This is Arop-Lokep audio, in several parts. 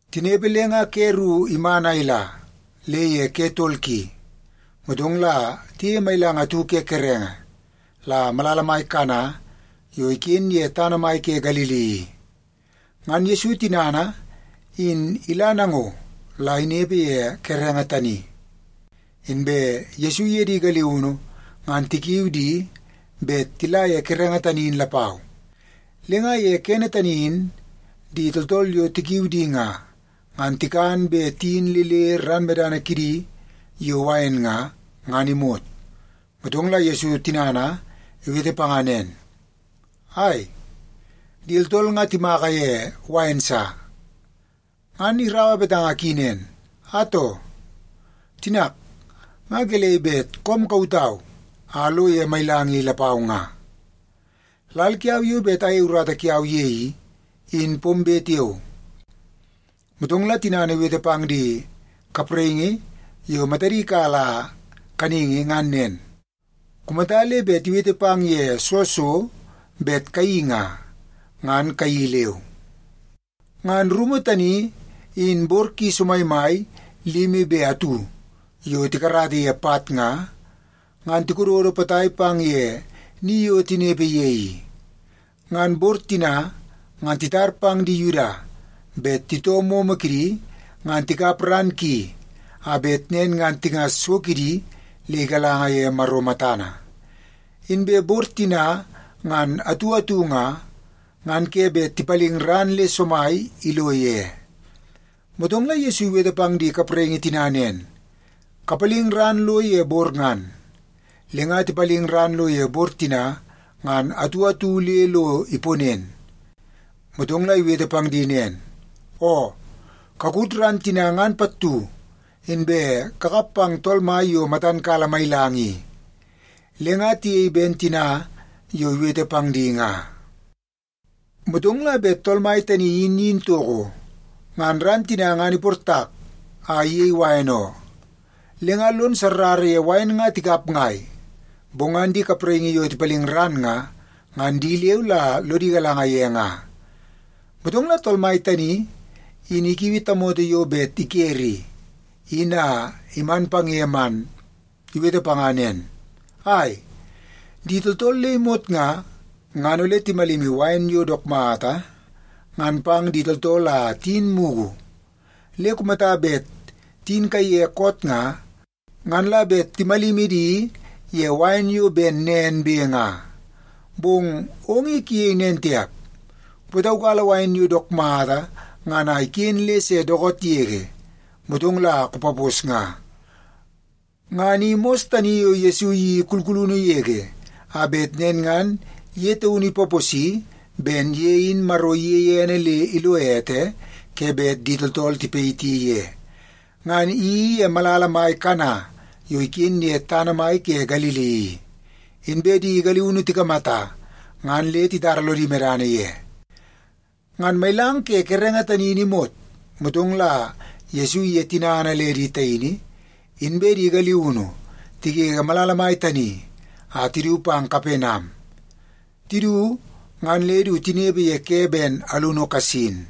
Tinepe le nga ke ru iman a ila le ye ke tol ki, motong la tiyeie mailang atu ke kerenge la malala mai Kana yo iken ye tana mai ke Galili i. Ngan Yesu tinana in ila nango la inepe ye kerenge tani. Inbe Yesu iye di galiunu ngan tikiu di bet tila ye kerenge tani in lapau. Le nga ye kene tani in, di tooltool yo tikiu di nga, ngan tikan be tiyin le le ran medana kidi yo wain nga, ngan imot. Motong la Yesu tinana iwete panga nen, “Ai, di tooltool nga timaka ye wain sa.” Ngan iraua betanga ki nen, “Atoo, tinak nga gelei bet koom kautau a alo ye mailang i lapau nga? Lal kiau yo bet ayei urata kiau ye i, in pombe tiao.” Motong la tinana iwete pang di kapraingi yo matadi kala kaningi ngan nen, “Kumata le bet iwete pang ye soo so bet kayeii nga, ngan kayeii leu.” Ngan rumu tani in bor ki somaimai limi be atu yo tikarata ye pat nga, ngan tikododo potai pang ye ni yo tinepe ye i. Ngan bor tina ngan titar pang di Yuda bet titoo momo kidi ngan tikap ran ki, a bet nen ngan tingas so kidi le igalanga ye Maro matana. Inbe bor tina ngan atu atu nga, ngan ke bet tipaling ran le somai ilo ye. Motong la Yesu iwete pang di kapraingi tina nen, “Kapaling ran lo ye bor ngan.” Le nga tipaling ran lo ye bor tina ngan atu atu le lo iponen. Motong la iwete pang di nen, “Oo, kakut ran tina ngan pattu, inbe kakap pang tool mai yo matan kala mailang i.” Le nga tiyei ben tina yo iwete pang di nga. Motong la bet tool mai tani in iyin toko, ngan ran tina ngan iportak a iyei wain oo. Le nga lon sarrara ye wain nga tikap ngai, bong ngan di kapraingi yo tipaling ran nga, ngan di leu la lodi galanga ye nga. Motong la tool mai tani in ikiui tamoto yo bet ikere i, in a iman pang ye man, iwete panga nen, “Ai, di tooltool le imot nga, ngan ole timalimi wain yo dook mata ngan pang di tooltool a tiyin mugu. Le kumata bet tiyin kaiye koot nga, ngan la bet timalimi di ye wain yo ben nen be nga. Bong ong i kuyei nen tiap, kupataukala wain yo dook mata ngan a iken le se dookoot yege, motong la kupapos nga.” Ngan i mos tani yo Yesu iyeii kulkulunu yege a bet nen ngan ye taunu ipaposi ben ye in Maro iyeie ene le ilo ete ke bet di tooltool tipayiti ye. Ngan iyeii ye malala mai Kana yo iken ye tana mai ke Galili i. Inbe di galiunu tikamata, ngan le titara lodi medana ye. Ngan mailang ke kerenge tani in imot, motong la Yesu iye tinana le di taini inbe di galiunu tigege malala mai tani a tidu pang Kapenam. Tidu, ngan le du tinepe ye ke ben alunu kasin.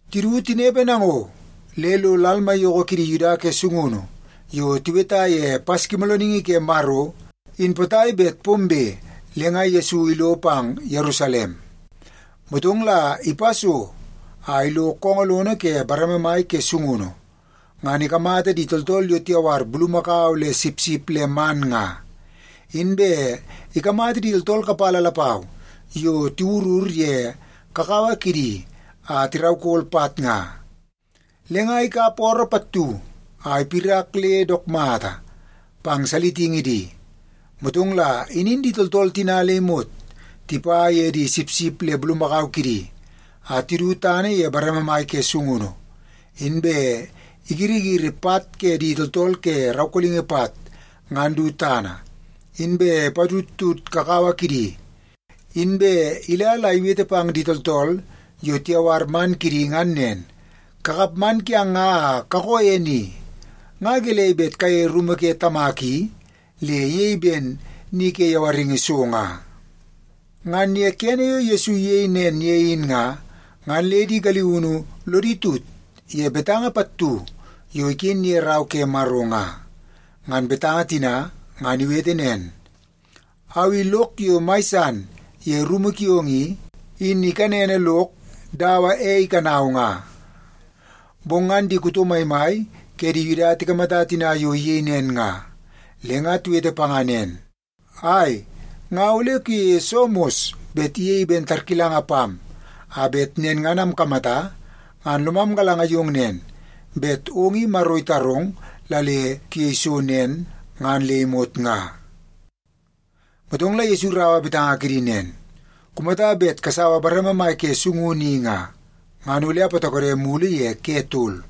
Tidu tinepe nango, le lo lal maiyoko kidi Yuda ke sungunu yo tiweta ye Paskimoolooningi ke Maro in potai bet pombe, le nga Yesu ilo pang Yerusalem. Motong la ipa so a ilo koongoo lono ke bareme mai ke sungunu, ngan ikamata di tooltool yo tiyawar bulumakau le sipsip le man nga. Inbe ikamata di tooltool kapala lapau yo tiwurur ye kakawa kidi a tiraukol pat nga. Le nga ikap ooroo pattu a ipirak le dook mata pang salitingi di. Motong la inin di tooltool tina le imot tipa ye di sipsip le bulumakau kidi a tidu tana ye bareme mai ke sungunu. Inbe igirigiri pat ke di tooltool ke raukolingi pat ngan du tana, inbe ipatudtud kakawa kidi. Inbe ila la iwete pang di tooltool yo tiyawar man kidi ngan nen, “Kakap man kiang nga a kakoo ye ni! Nga gelei bet kayeie rumu ke Tamak i, le iyei ben ni ke yawaringi so nga!” Ngan ye kene yo Yesu iyei nen ye in nga, ngan le di galiunu lodi tut ye betanga pattu yo iken ye Rau ke Maro nga. Ngan betanga tina ngan iwete nen, “Au i lok yo mai san ye rumu kiong i, in ikanene lok dawa ei ikanau nga.” Bong ngan di kuto maimai ke di Yuda tikamata tina yo iyei nen nga, le nga tiwete panga nen, “Ai, nga ole kuyeie soo mos bet iyei ben tarkilanga pam, a bet nen ngan amkamata ngan lomam galanga yong nen, bet ong i Maro itarong la le kuyei so yo nen ngan le imot nga?” Motong la Yesu iraua betanga kidi nen, “Kumata bet kasaua bareme mai ke sungunu i nga, ngan ole apatokode mulu ye ke tol.”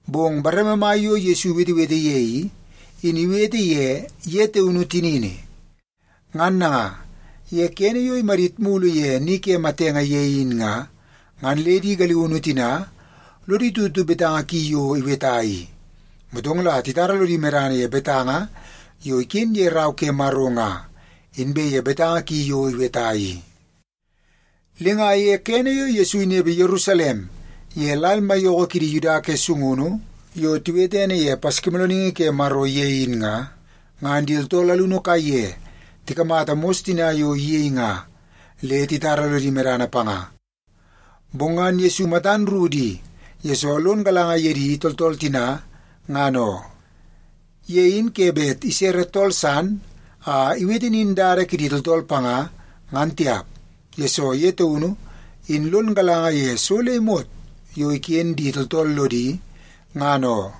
Bong bareme mai yo Yesu iwetewete ye i, in iwete ye ye taunu tinini. Ngan nanga, ye kene yo imadit mulu ye ni ke matenge ye in nga, ngan le di galiunu tina lodi tutu betanga ki yo iweta i. Motong la titara lodi medana ye betanga yo iken ye Rau ke Maro nga, inbe ye betanga ki yo iweta i. Le nga ye kene yo Yesu inepe Yerusalem ye lal maiyoko ke di Yuda ke sungunu yo tiwete ene ye Paskimoolooningi ke Maro ye in nga, ngan di tooltool alunu kaiye tikamata mos tina yo iyei nga, le titara lodi medana panga. Bong ngan Yesu matan ru di, yesoo lon galanga ye di tooltool tina, ngan oo. Ye in ke bet isere tool san a iwete nin dada kidi tooltool panga, ngan tiap. Yesoo ye taunu, in lon galanga ye so le imot yo iken di tooltool lodi, ngan oo.